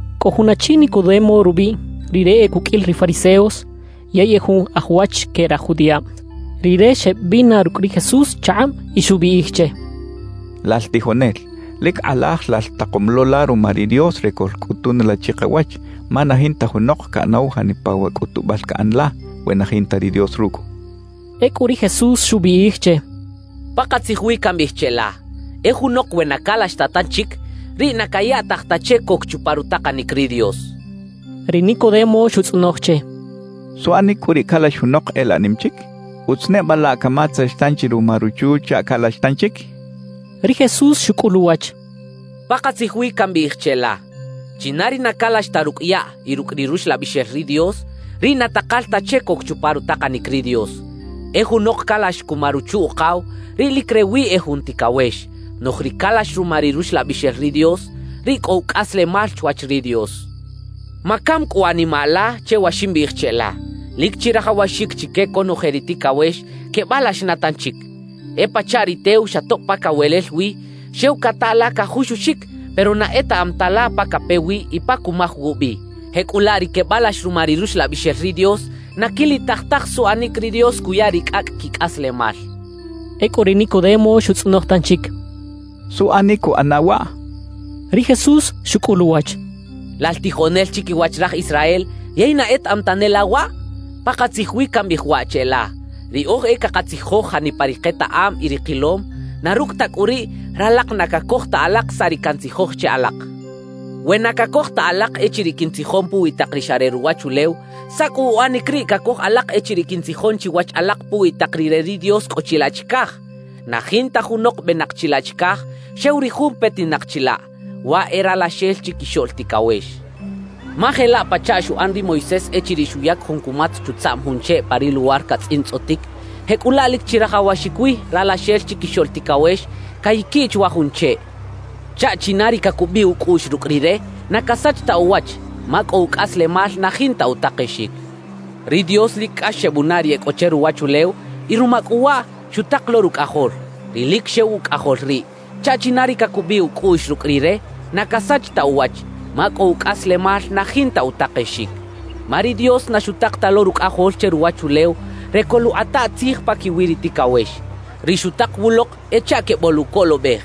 Cꞌo jun achi Nicodemo rubiꞌ; rire e cuqꞌuil ri fariseos yey e jun aj wach que raj judiꞌab. Rire xeꞌbina rucꞌ ri Jesús chakꞌab y xubiꞌij che: —Lal tijonel, lic kꞌalaj lal takom lo la ruma ri Dios re coꞌlcꞌutun la chikawach, ma na jinta junok caꞌanaw janipa wa cꞌutubal caꞌan la, we na jinta ri Dios rucꞌ —xchaꞌ. Ecꞌu ri Jesús xubiꞌij che: —Pakatzij wi cambiꞌij cheꞌla: E junok we na calax ta tanchic, riꞌ na cayaꞌtaj ta che coc chupa rutakanic ri Dios —xchaꞌ. Ri Nicodemo xutzꞌonoj che: —¿Suꞌanic cꞌu riꞌ calax junok e laꞌ nim chic? ¿Utz neba laꞌ camatzex tanchi ruma ruchu chaꞌ calax tanchic? —xchaꞌ. Ri Jesús xucꞌul uwach: —Pakatzij wi cambiꞌij cheꞌla: China ri na calax ta rucꞌ yaꞌ y rucꞌ ri Ruxlabixel ri Dios, riꞌ na takal ta che coc chupa rutakanic ri Dios. E junok calax cuma ruchu-ukaw, riꞌ lic rewi e jun ticawex; noꞌj ri calax ruma ri Ruxlabixel ri Dios, riꞌ cꞌo ucꞌaslemal chwach ri Dios. Macam cꞌu animaꞌ la che wa ximbiꞌij cheꞌla: “Lic chirajawaxic chique conoje ri ticawex quebalax na tanchic.” E pachaꞌ ri tew xa tob pa cawelel wi, xew cata la cajuxuxic, pero na etaꞌam ta la pa cape wi y pa cumaj wubi. Jecꞌulaꞌ ri quebalax ruma ri Ruxlabixel ri Dios na quilitaj taj suꞌanic ri Dios cuya ri cꞌacꞌ quicꞌaslemal —xchaꞌ. Ecꞌu ri Nicodemo xutzꞌonoj tanchic: —¿Suꞌanic cuꞌana waꞌ? —xchaꞌ. Ri Jesús xucꞌul uwach: —Lal tijonel chiquiwach raj Israel, ¿yey na etaꞌam tane la waꞌ? Pakatzij wi cambiꞌij waꞌ cheꞌla: Riꞌoj e cakatzijoj janipa ri ketaꞌam y ri kilom; na rucꞌ ta cꞌu riꞌ, ralak na cacoj ta alak saꞌ ri cantzijoj che alak. We na cacoj ta alak echiriꞌ quintzijon puwi tak ri xa re ruwachulew, ¿saꞌ cꞌu uꞌanic riꞌ cacoj alak echiriꞌ quintzijon chiwach alak puwi tak ri re ri Dios cꞌo chilaꞌ chicaj? Na jinta junok benak chilaꞌ chicaj, xew ri jun petinak chilaꞌ, waꞌ e Ralaxel Chiquixoꞌl Ticawex. Ma jelaꞌ pachaꞌ xuꞌan ri Moisés echiriꞌ xuyac jun cumatz chutzaꞌm jun cheꞌ pa ri luwar catzꞌintzꞌotic; jecꞌulaꞌ lic chirajawaxic wi Ralaxel Chiquixoꞌl Ticawex cayaquiꞌ chwa jun cheꞌ chaꞌ china ri cacubiꞌ ucꞌuꞌx rucꞌ Rire, na casach ta uwach, ma cꞌo ucꞌaslemal na jinta utakexic. »Ri Dios lic cꞌax xebunaꞌ ri e cꞌo che ruwachulew; y ruma cꞌu waꞌ, xutak lo Rucꞌajol, ri lic xew Ucꞌajol riꞌ, chaꞌ china ri cacubiꞌ ucꞌuꞌx rucꞌ Rire na casach ta uwach, ma cꞌo ucꞌaslemal na jinta utakexic. Ma ri Dios na xutak ta lo Rucꞌajol che ruwachulew re coluꞌkꞌata tzij paquiwi ri ticawex; ri xutak wulok e chaꞌ queboluꞌcolobej.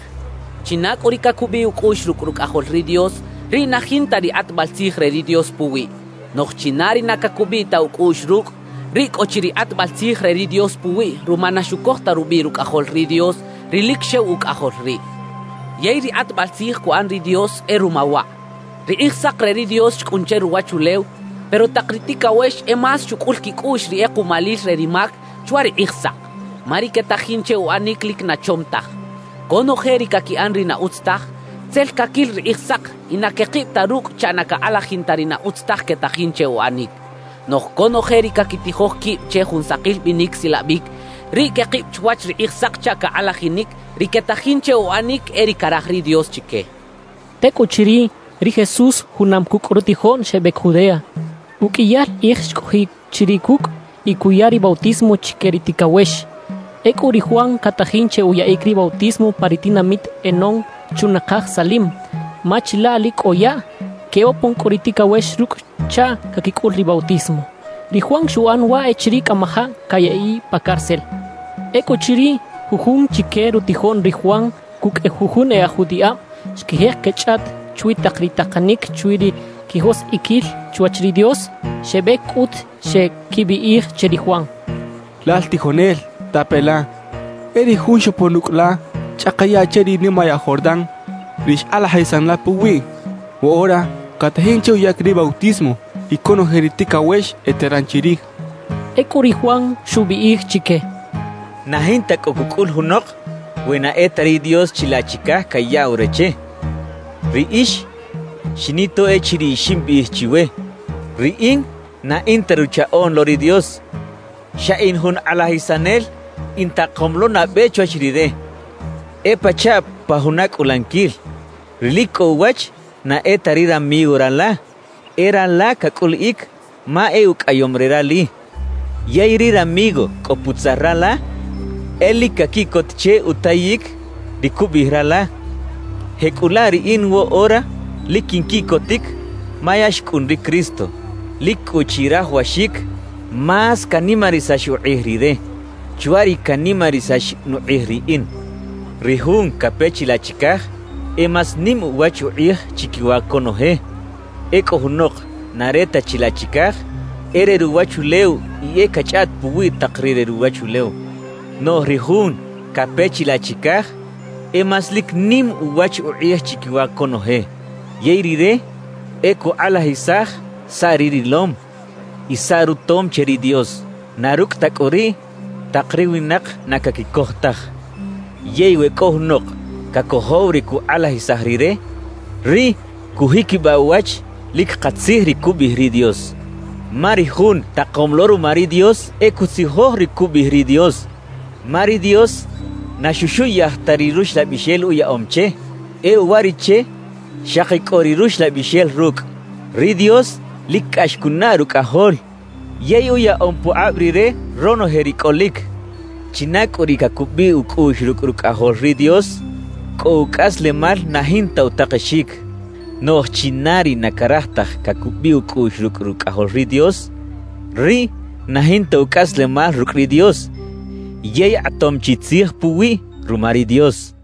China cꞌu ri cacubiꞌ ucꞌuꞌx rucꞌ Rucꞌajol ri Dios, riꞌ na jinta ri kꞌatbal tzij re ri Dios puwiꞌ; noꞌj china ri na cacubiꞌ ta ucꞌuꞌx rucꞌ, riꞌ cꞌo chi ri kꞌatbal tzij re ri Dios puwiꞌ ruma na xucoj ta rubiꞌ Rucꞌajol ri Dios, ri lic xew Ucꞌajol riꞌ. Yey ri kꞌatbal tzij cuꞌan ri Dios e ruma waꞌ: Ri Kꞌijsak re ri Dios xcꞌun che ruwachulew, pero tak ri ticawex e más xucꞌul quicꞌuꞌx ri kꞌekuꞌmalil re ri mac chwa ri Kꞌijsak; ma ri quetajin che uꞌanic, lic na chom taj. Conoje ri caquiꞌan ri na utz taj, tzel caquil ri Kꞌijsak y na quekib ta rucꞌ chaꞌ na cakꞌalajin ta ri na utz taj quetajin che uꞌanic. Noꞌj conoje ri caquitijoj quib che jun sakil binic silabic, riꞌ quekib chwach ri Kꞌijsak chaꞌ cakꞌalajinic, ri quetajin che uꞌanic e ri caraj ri Dios chique —xchaꞌ. Tecꞌuchiriꞌ, ri Jesús junam cucꞌ rutijoꞌn xebec Judea; uqꞌuiyal kꞌij xcꞌojiꞌ chiriꞌ cucꞌ y cuya ri bautismo chique ri ticawex. Ecꞌu ri Juan catajin che uyaꞌic ri bautismo pa ri tinamit Enón chunakaj Salim, ma chilaꞌ lic cꞌo yaꞌ. Quebopon cꞌu ri ticawex rucꞌ chaꞌ caquicꞌul ri bautismo. Ri Juan xuꞌan waꞌ echiriꞌ cꞌamajaꞌ cayaꞌiꞌ pa cárcel. Ecꞌuchiriꞌ, jujun chique rutijoꞌn ri Juan cucꞌ jujun e aj judiꞌab xquijek quechꞌaꞌt chwi tak ri takanic chwi ri quijoskꞌiquil chwach ri Dios. Xebec cꞌut xeꞌquibiꞌij che ri Juan: —Lal tijonel, tape la, e ri jun xopon ucꞌ la chꞌaka yaꞌ che ri nimayaꞌ Jordán, ri xkꞌalajisan la puwiꞌ, woꞌora catajin che uyaꞌic ri bautismo y conoje ri ticawex eteran chirij —xechaꞌ. Ecꞌu ri Juan xubiꞌij chique: «Na jinta cꞌo cucꞌul junok we na e ta ri Dios chilaꞌ chicaj cayaꞌw re che. Riꞌix xinito echiriꞌ ximbiꞌij chiwe: Riꞌin na in ta Ruchaꞌoꞌn lo ri Dios, xa in jun kꞌalajisanel intakom lo nabe chwach Rire. »E pachaꞌ pa juna cꞌulaniquil. Ri lic cꞌo uwach na e ta ri ramigo rala, e rala cacꞌuliꞌic ma e ucꞌaꞌyom re rali. Yey ri ramigo cꞌo putzal rala, e lic caquiꞌcot che utayic ri cubiꞌij rala. Jecꞌulaꞌ riꞌin woꞌora lic quinquiꞌcotic ma ya xcꞌun ri Cristo. Lic cꞌu chirajawaxic más canimarisax ukꞌij rire, chwa ri canimarisax nukꞌij riꞌin. »Ri jun cape chilaꞌ chicaj, e más nim uwach ukꞌij chiquiwa conoje. Ecꞌu junok na re ta chilaꞌ chicaj, e re ruwachulew y e cachꞌaꞌt puwi tak ri re ruwachulew. Noꞌj ri jun cape chilaꞌ chicaj, e más lic nim uwach ukꞌij chiquiwa conoje. Yey rire e cukꞌalajisaj saꞌ ri rilom y saꞌ rutom che ri Dios; na rucꞌ ta cꞌu riꞌ, tak ri winak na caquicoj taj. Yey we cꞌo junok cacojow ri cukꞌalajisaj rire, riꞌ cujiquibaꞌ uwach lic katzij ri cubiꞌij ri Dios. Ma ri jun takom lo ruma ri Dios, e cutzijoj ri cubiꞌij ri Dios. Ma ri Dios na xuxuꞌyaj ta ri Ruxlabixel uyaꞌom che; e uwariꞌche, xaki cꞌo ri Ruxlabixel rucꞌ. Ri Dios lic cꞌax cunaꞌ Rucꞌajol yey uyaꞌom pukꞌab rire ronoje ri cꞌolic. China cꞌu ri cacubiꞌ ucꞌuꞌx rucꞌ Rucꞌajol ri Dios, cꞌo ucꞌaslemal na jinta utakexic; noꞌj china ri na caraj taj cacubiꞌ ucꞌuꞌx rucꞌ Rucꞌajol ri Dios, riꞌ na jinta ucꞌaslemal rucꞌ ri Dios yey kꞌatom chi tzij puwiꞌ ruma ri Dios» xchaꞌ.